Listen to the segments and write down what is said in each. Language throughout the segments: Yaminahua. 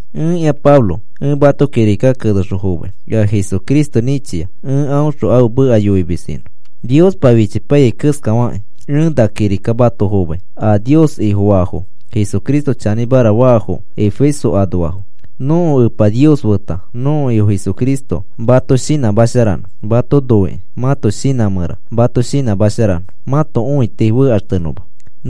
Ẽkĩa Pablo ẽ mato kirika kenexõ fomai. Ea Jesucristo nĩchia ẽ aõxõ ãfe meka yoimis inõ, Niospa fichipaiyai keskafakĩ. Ẽ na kirika mato fomai a Nios Ifofaafo, Jesucristo chanĩmara faafo, Efeso anoafo. Nõko Epa Nios feta nõko Ifo Jesucristo mato shinãsharanõ mato noikĩ mãto shinã mẽra mato shinãmasharanõ, mãto õiti fekaxtenõma.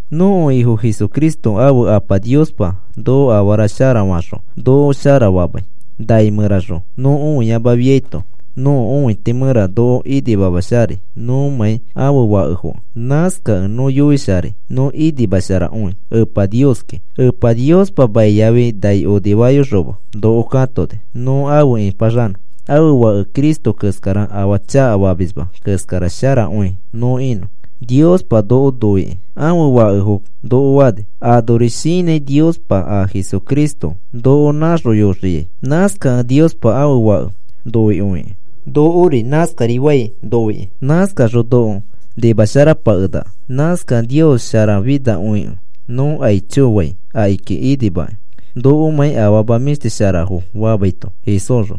Nõko Ifo Jesucristo ãfe Apa Niospa noko afara sharafo noko shara famai, nai mẽraxõ nõ õiamafiaito nõko õiti mẽra noko inimamasharai nõmãi ãfe fakefokẽ. Nãskakẽ nõ yoisharai nõ inimasharakõi Epa Nioski. Epa Niospa mai yafi nai onifayoxoma noko katoni nõ afe ĩpaxanõ ãfe Fake Cristo keskara afaa chakafamisma keskara sharakõi nõ inõ. Niospa noko noikĩ, ãfe fakefo noko fani. Anori shinãni Niospa a Jesucristo noko nãxoyoxiai. Nãskakẽ Niospa ãfe Fake noikõikĩ nokori nãskarifai noikĩ. Nãskaxõ noko nimasharapakenaka. Nãskakẽ Nios sharafinakõikẽ nõ aicho fai akiki inimakĩ nokomãi afama mĩshti sharafo famaito Jesúsxõ.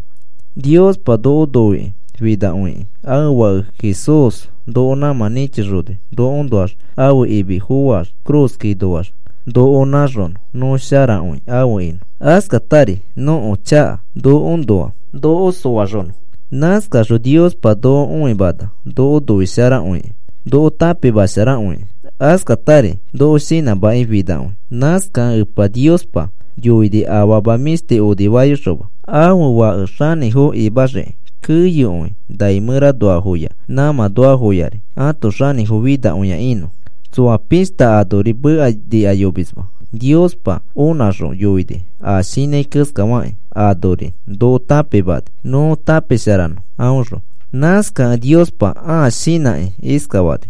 Niospa noko noikĩ finakõikĩ ãfe Fake Jesús noko nãmã nĩchixoni nokoõnoax ãfe imi foax ifi cruz ikakinoax noko nãxonõ nõ sharakõi afe inõ, askatari nõko chaka nokoõnoa noko soxonõ. Nãskaxõ Niospa noko õimana noko noisharakõikĩ noko tãpimasharakõikĩ, askatari noko shinãmakĩ finakõi. Nãskakẽ Epa Niospa yoini afama mĩshti onifayoxoma ãfe Fake xanĩfo imaxikĩ, keyokõi, nai mẽranoafoya, nãmãnoafoyari ãto xanĩfo finakõi inõ. Tsoa pishta anori meka nikayomisma Niospa onãxõ yoini a shinãi keskafakĩ, anori noko tãpimani nõ tãpisharanõ aõxõ. Nãskakẽ Niospa ãa shinãkĩ iskafani: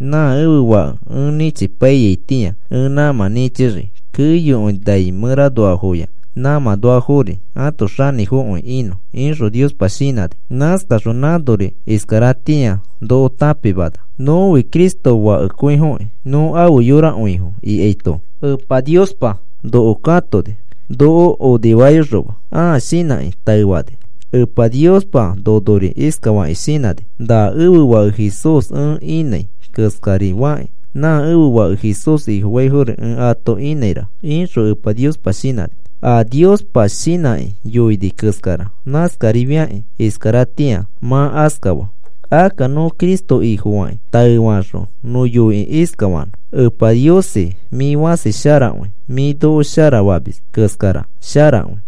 “Nã ẽfe Fake ẽ nĩchipaiyaitĩa ẽ nãmã nĩchixii keyokõi nai mẽranoafoya, nãmãnoafori ãto xanĩfokõi inõ,” ixõ Niospa shinãni. Nãskaxõ nãnori iskaratĩa noko tãpimana. Nõfi Cristo fakekõifokĩ. Nõ afe yorakõifo ikaito, Epa Niospa noko katoni noko onifayoxoma ãa shinãkĩ taefani. Epa Niospa nonori iskafakĩ shinãni: “Na ẽfe Fake Jesús ẽ inãi keskari fakĩ nã ẽfe Fake Jesús Ifofaifori ẽ ato inãira,” ixõ Epa Niospa shinãni. A Niospa shinãkĩ yoini keskara, nãskarifakĩ iskaratĩa mã askafaa. Akka nõ Cristo Ifofakĩ taefaxõ nõ yoikĩ iskafanõ: “Epa Niosi, mĩ fãsi sharakõi. Mĩ noko sharafamis keskara sharakõi.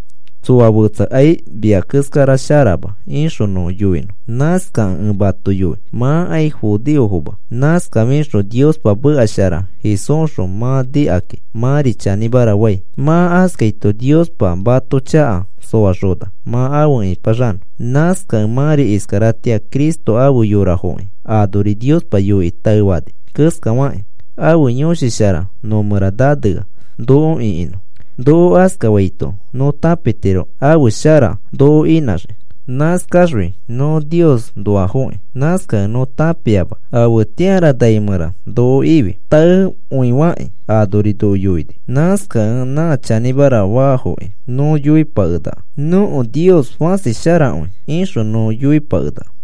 Tsoa fetsakai mia keskara sharama,” ixõ nõ yoinõ. Nãskakẽ ẽ mato yoi mãkai judeofoma. Nãskafixõ Niospa meka shara Jesúsxõ mã nikakĩ mãri chanĩmara fai. Mã askaito Niospa mato chaka soaxona mã afe nipaxanõ. Nãskakẽ mãri iskaratĩa Cristo afe yorafokĩ. Anori Niospa yoikĩ taefani keskafakĩ, ãfe Yõshi Shara nõ mẽra nanea noko ĩkinõ. Noko askafaito nõ tãpitiro ãfe shara noko inãxii. Nãskaxfi nõ Niosnoafoki. Nãskakẽ nõ tãpiama afetĩara nai mẽra noko ifi. Taekõifakĩ anori noko yoini. Nãskakẽ nã chanĩmara fakĩ nõ yoipakenaka: “Nõko Nios fãsi sharakõi,” ixõ nõ yoipakenaka.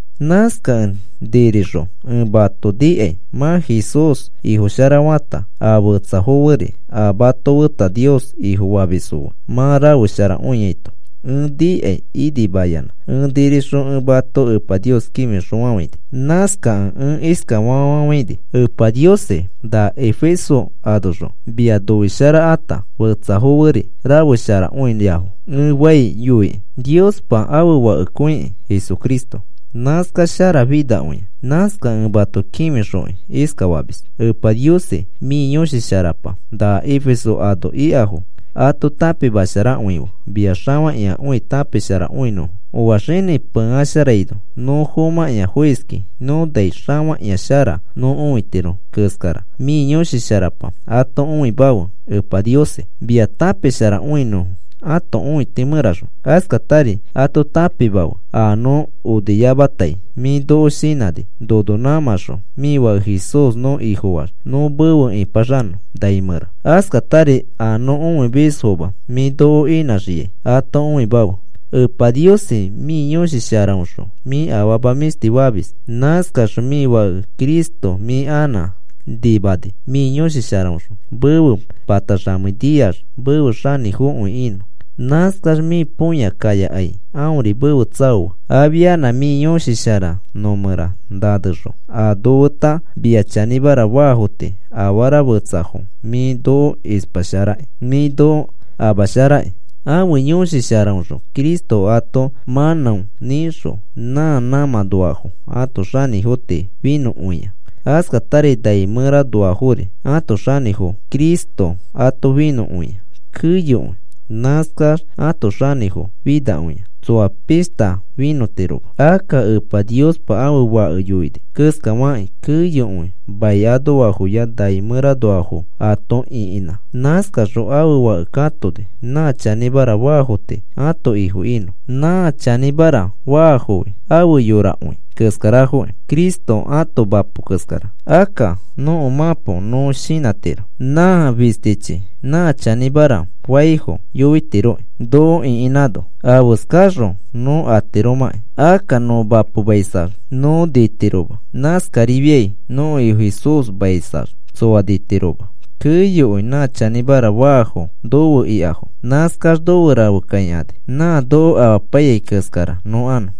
Nãskakẽ nirixõ ẽ mato nikai mã Jesús Ifo sharafata, a fetsafo feri a mato feta Nios Ifofamisfo fe mã rafesharakõiaito ẽ nikakĩ inimayanã ẽ nirixõ ẽ mato Epa Nios kĩfixõfafãini. Nãskakẽ ẽ iskafa fafafãini: “Epa Niosi, na Efeso anoxõ mia noisharakata fetsafo feri rafesharakõiafo,” ẽ fai yoikĩ. Niospa ãfe Fakekõikĩ Jesucristo. Nãskax sharafinakõia. Nãskakẽ ẽ mato kĩfixokĩ iskafamis: “Epa Niosi, mĩ Yõshi Sharapa na Efeso ano ikafo ato tãpimasharakõife mia xafakĩakõi tãpisharakõinõfo. Oa xini peisharaino nõ fomãkĩa foiski nõ nai xafakĩakõishara nõ õitiro keskara, mĩ Yõshi Sharapa ato õimafe Epa Niosi, mia tãpisharakõinõfo ãto õiti mẽraxõ. Askatari ato tãpimafe a nõ oniyamatai mĩ noko shinãni nono nãmãxõ mĩ Fake Jesús nõ Ifofaax nõ mefe ĩpaxanõ nai mẽra. Askatari a nõ õimismafo mĩ noko inãxiai ato õimafe. Epa Niosi, mĩ Yõshi Sharaõxõ mĩ afama mĩshti famis. Nãskaxõ mĩ Fake Cristo mĩ anã nimani mĩ Yõshi Sharaõxõ mefe pataxamei niax mefe xanĩfokõi inõ. Nãskax mĩ põya kayakai aõri mefe tsaoa. Afia mĩ Yõshi Shara nõ mẽra nanexõ a nofeta mia chanĩmara faafo tii afara fetsafo mĩ noko ispasharakĩ mĩ noko amasharakĩ.” Ãfe Yõshi Sharaõxõ Cristo ato mãnão nĩxõ, nã nãmãnoafo ãto xanĩfo tii finõkõia. Askatari nai mẽranoafori ãto xanĩfofo Cristo ato finõkõia keyokõi. Nãskax ãto xanĩfo finakõia. Tsoa pishta finõtiroma. Akka Epa Niospa ãfe Fake yoini keskafakĩ keyokõi mai anoafoya nai mẽranoafo ato ĩkinã. Nãskaxõ ãfe Fake katoni nã chanĩmara faafo tii ãto Ifo inõ. Nã chanĩmara faafofi ãfe yorakõi keskarafoki. Cristo ãto mapo keskara. Akka nõko mãpo nõ shinãtiro. Nã fistichi nã chanĩmara faifo yoitiroki, noko ĩkinãno afeskaxõ nõ atiromãki. Akka nõ mapomaisax nõ nitiroma. Nãskarifiai nõko Ifo Jesúsmaisax tsoa nitiroma. Keyokõi nã chanĩmara faafo nofe ikafo. Nãskax nofe rafe kakãini nã noko amapaiyai keskara nõ anõ.